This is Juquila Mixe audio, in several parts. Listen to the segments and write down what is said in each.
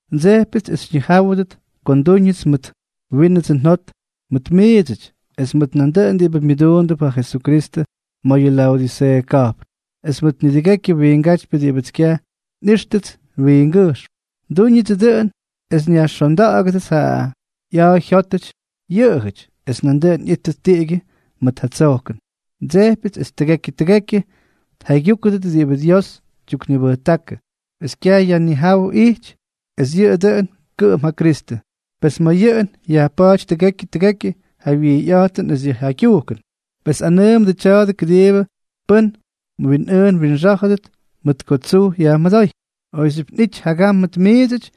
Ndsejpyʉts es xyñijáwʉdʉt ko ndúñʉts mʉt wínʉdsʉ njot mʉt miidsʉty, es mʉt nandʉꞌʉn diꞌibʉ myʉduundʉp ja Jesukristʉ ma̱ yʉ Laodiseeʉ ka̱jpn, es mʉt nidʉgekyʉ wiingátypyʉ diꞌibʉts kyaj xyꞌíxtʉts wingʉjxm. Ndúñʉdsʉ dʉꞌʉn es nyajxonda̱ꞌa̱gʉdʉts ja ꞌya̱a̱ jyótʉty yʉꞌʉjʉty, es nandʉꞌʉn ꞌyíttʉt tiꞌigyʉ ma̱ ja tsojkʉn. Ndsejpyʉts es tʉgekyʉ tʉgekyʉ tjaygyúkʉdʉt diꞌibʉ Dios tyuknibʉjtákʉ es kyaj yajnijáwʉ ijty, es yʉꞌʉ dʉꞌʉn kʉꞌʉm ja Kristʉ. Pes ma̱ yʉꞌʉn yajpa̱a̱ty tʉgekyʉ tʉgekyʉ ja wijyꞌa̱jtʉn esʉ jaygyujkʉn. Pes nꞌanʉʉmʉdʉ tya̱a̱dʉ kʉdiibʉ pʉ́n mwinꞌʉʉn mwinxá̱jʉdʉt mʉt ko tsuj yajmʉdóy. Oyxyʉ́pʉts nꞌity jagam mʉt miidsʉty,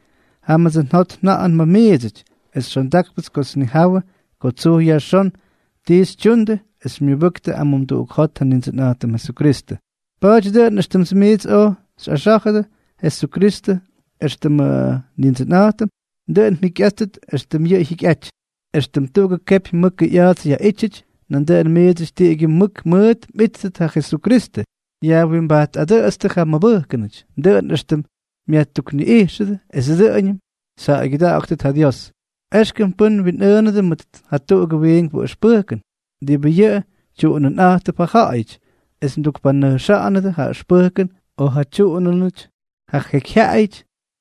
jámʉts njot nja̱ꞌa̱jʉn ma̱ miidsʉty, es xondákpʉts kots nnijawʉ ko tsuj yajxón ti xytyundʉ es xymyʉbʉktʉ amumduꞌuk jot ja Nindsʉnꞌa̱jtʉm Jesukristʉ. Pa̱a̱ty dʉꞌʉn éxtʉm miits oj xyꞌaxá̱jʉdʉ Jesukristʉ éxtʉmʉ Nindsʉnꞌa̱jtʉm, dʉꞌʉn mjikyꞌáttʉt éxtʉm yʉꞌʉ jyikyꞌajty. Extʉm tuꞌugʉ kepy mʉkʉ ꞌya̱a̱ts yaꞌítyʉty, nandʉꞌʉn miidsʉty tiꞌigyʉ mʉk mʉʉt mꞌíttʉt ja Jesukristʉ. Yajwimbajtꞌadʉꞌʉtstʉ ja mmʉbʉjkʉnʉty, dʉꞌʉn éxtʉm myajtukniꞌijxʉdʉ, es dʉꞌʉñʉm xyjaꞌaygyʉda̱ꞌa̱ktʉt ja Dios. Exkʉm pʉ́n mwinꞌʉʉnʉdʉ mʉt jatuꞌugʉ wiinkpʉ ʉxpʉjkʉn, diꞌibʉ yʉꞌʉ tyuꞌunʉnꞌa̱jttʉp ja ja̱ꞌa̱yʉty, es mdukpanʉjxa̱ꞌa̱nʉdʉ ja ʉxpʉjkʉn o ja tyuꞌunʉnʉty ja jekyjyaꞌayʉty,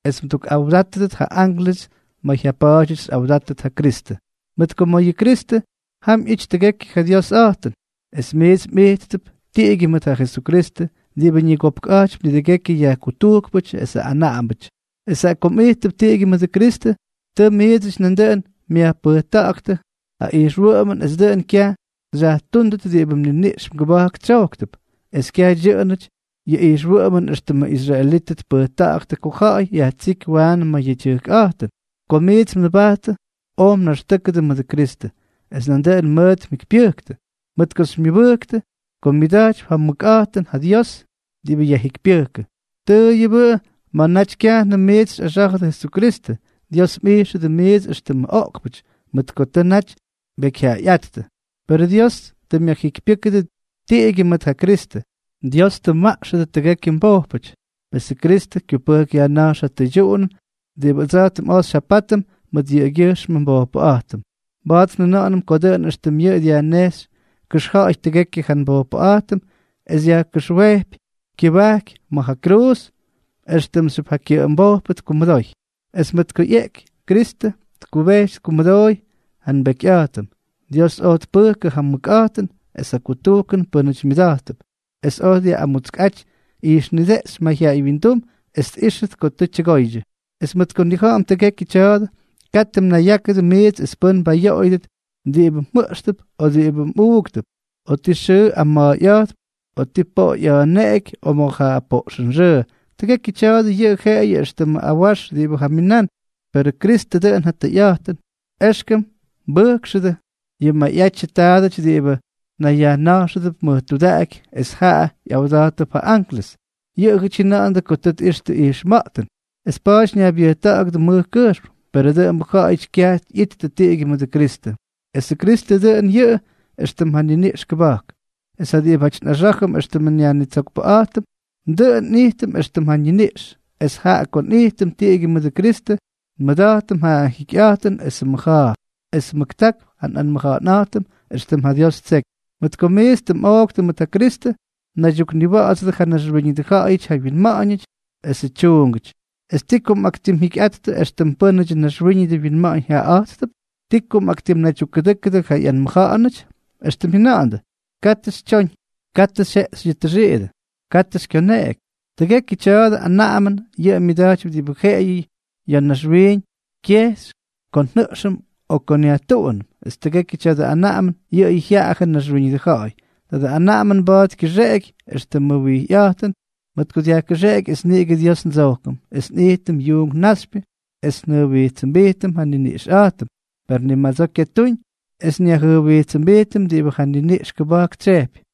es mdukꞌawdátʉdʉt ja ánklʉsʉty ma̱ jyapa̱a̱dyʉty xyꞌawdátʉt ja Kristʉ. Mʉt ko ma̱ yʉ Jesukristʉ, jam ꞌyity tʉgekyʉ ja Diosꞌa̱jtʉn, es miits mꞌijttʉp tiꞌigyʉ mʉt ja Jesukristʉ, diꞌibʉ ñigopkꞌa̱jtypy nidʉgekyʉ yajkutujkpʉty es anaꞌambʉty. Es jaꞌa ko mꞌijttʉp tiꞌigyʉ mʉdʉ Kristʉ, tʉ miidsʉty nandʉꞌʉn myajpʉjta̱ꞌa̱ktʉ ja ijxwʉꞌʉmʉn es dʉꞌʉn kyaj xyajtúndʉt diꞌibʉ mniniꞌx mgʉba̱jk tsyojktʉp, es kyaj dyʉꞌʉnʉty yʉ ijxwʉꞌʉmʉn éxtʉmʉ israelítʉty tpʉjta̱ꞌa̱ktʉ ko ja̱ꞌa̱y yajtsíky waanʉ ma̱ yedyʉjkꞌa̱jtʉn. Ko miits mnʉbajttʉ, oj mnaxtʉ́kʉdʉ mʉdʉ Kristʉ, es nandʉꞌʉn mʉʉt mjikypyʉjktʉ, mʉt ko xymyʉbʉjktʉ ko myʉda̱jtypy ja mʉkꞌa̱jtʉn ja Dios diꞌibʉ yajjikypyʉjkʉ. Tʉʉyʉbʉ ma̱ naty kyajnʉm miits xyꞌaxá̱jʉdʉ Jesukristʉ, Dios mꞌijxʉdʉ miits éxtʉmʉ oꞌkpʉty, mʉt ko naty mbekyjyaꞌayꞌáttʉ; perʉ Dios tʉ myajjikypyʉ́kʉdʉ tiꞌigyʉ mʉt ja Kristʉ. Dios tʉ mmaꞌxʉdʉ tʉgekyʉ mbojpʉty. Pesʉ Kristʉ kyupʉjk yajna̱jx ja tʉydyuꞌunʉn diꞌibʉ ʉdsa̱jtʉm oj xyjapátʉm mʉt yʉꞌʉgyʉjxmʉ nbojpʉꞌa̱jtʉm. Mba̱a̱t njʉna̱ꞌa̱nʉm ko dʉꞌʉn éxtʉm yʉꞌʉ dyajnejxy kʉxja̱ꞌa̱y tʉgekyʉ ja nbojpʉꞌa̱jtʉm es yajkʉxwejpy kyʉbajky ma̱ ja kruuz, éxtʉmxyʉp ja kyʉꞌʉmbojpʉ tkumʉdoy. Es mʉt ko ꞌyeꞌky, Kristʉ tkʉbejty tkumʉdooy ja nbekyꞌa̱jtʉm. Dios oj tpʉjkʉ ja mʉkꞌa̱jtʉn es ja kutujkʉn pʉ́nʉty myʉda̱jttʉp, es oj dyaꞌꞌamutskꞌaty ijxnideꞌxy mayjyaꞌay wyindum es tꞌíxtʉt ko tʉ tyʉgoydyʉ. Es mʉt ko nnija̱ꞌa̱m tʉgekyʉ tya̱a̱dʉ, katʉ mnayyákʉdʉ miits es pʉ́n mbayoꞌoyʉdʉt diꞌibʉ mjʉꞌxtʉp, o diꞌibʉ mꞌuꞌktʉp, o ti xʉʉ mꞌama̱a̱yꞌa̱jttʉp, o ti poꞌo ꞌya̱a̱neꞌeky, o ma̱ ja poꞌxʉnxʉʉ. Tʉgekyʉ tya̱a̱dʉ yʉꞌʉ jeꞌeyʉ éxtʉmʉ awax diꞌibʉ jaminán; perʉ Kristʉ dʉꞌʉn ja tʉyꞌa̱jtʉn. Exkʉm mbʉjkxʉdʉ yʉ mayꞌatyʉ taadʉty diꞌibʉ nayyajna̱jxʉdʉp mʉj tudaꞌaky es jaꞌa ꞌyawda̱jttʉp ja ánklʉsʉty. Yʉꞌʉjʉty jyʉna̱ꞌa̱ndʉ ko tʉ tꞌixtʉ ijxma̱ꞌtʉn, es pa̱a̱ty ñaybyʉjta̱ꞌa̱gʉdʉ mʉj kʉjxm. Perʉ dʉꞌʉmbʉ ja̱ꞌa̱yʉty kyaj ꞌyittʉ tiꞌigyʉ mʉdʉ Kristʉ. Esʉ Kristʉ, dʉꞌʉn yʉꞌʉ éxtʉm ja niniꞌx kʉba̱jk, es ja diꞌibáty nꞌaxá̱jʉm éxtʉmʉ nYajnitsokpʉꞌa̱jtʉm, dʉꞌʉn nꞌijtʉm éxtʉm ja ñiniꞌx. Esʉ jaꞌa ko nꞌijtʉm tiꞌigyʉ mʉdʉ Kristʉ, nmʉda̱jtʉm ja jikyꞌa̱jtʉn esʉ mʉja̱a̱, es mʉktákp ja nꞌanmʉja̱ꞌa̱nꞌa̱jtʉm éxtʉm ja Dios ttseky. Mʉt ko miits tʉ mꞌooktʉ mʉt ja Kristʉ, mnaydyukniwa̱ꞌa̱dsʉdʉ ja naxwíñʉdʉ ja̱ꞌa̱yʉty ja wyinma̱ꞌa̱ñʉty esʉ tyuungʉty. ¿Es ti ko mꞌaktimjikyꞌattʉ éxtʉm pʉ́nʉdyʉ naxwíñʉdʉ winma̱ꞌa̱ñ jaꞌaꞌa̱jtʉdʉp?, ¿ti ko mꞌaktimnaydyukkʉdʉ́kʉdʉ ja ꞌyanaꞌamʉnʉty?, éxtʉm jyʉna̱ꞌa̱ndʉ: “Katʉ xytyoñ. Katʉ xyjeꞌxy yʉ tʉxiidʉ. Katʉ xykyoneꞌeky.” Tʉgekyʉ tya̱dʉ anaꞌamʉn yʉꞌʉ myadyakypy diꞌibʉ jeꞌeyʉ ya̱ naxwiiñ kyexy ko njʉꞌxʉm o ko nyajtuꞌunʉm, es tʉgekyʉ tya̱dʉ anaꞌamʉn yʉꞌʉyʉ jyaꞌajʉ naxwíñʉdʉ ja̱ꞌa̱y. Tadʉ anaꞌamʉn mba̱a̱t kyʉxeꞌeky éxtʉmʉ wijyꞌa̱jtʉn, mʉt ko dyajkʉxeꞌeky es niꞌigʉ Dios ndsojkʉm, es nꞌijtʉm yuunk naxypyʉ, es njʉjwijtsʉmbijtʉm ja nniniꞌxꞌa̱jtʉm; per ni madsoo kyatúñ es nnayjyʉjwijtsʉmbijtʉm diꞌibʉ ja niniꞌx kʉba̱jk tsyejpy.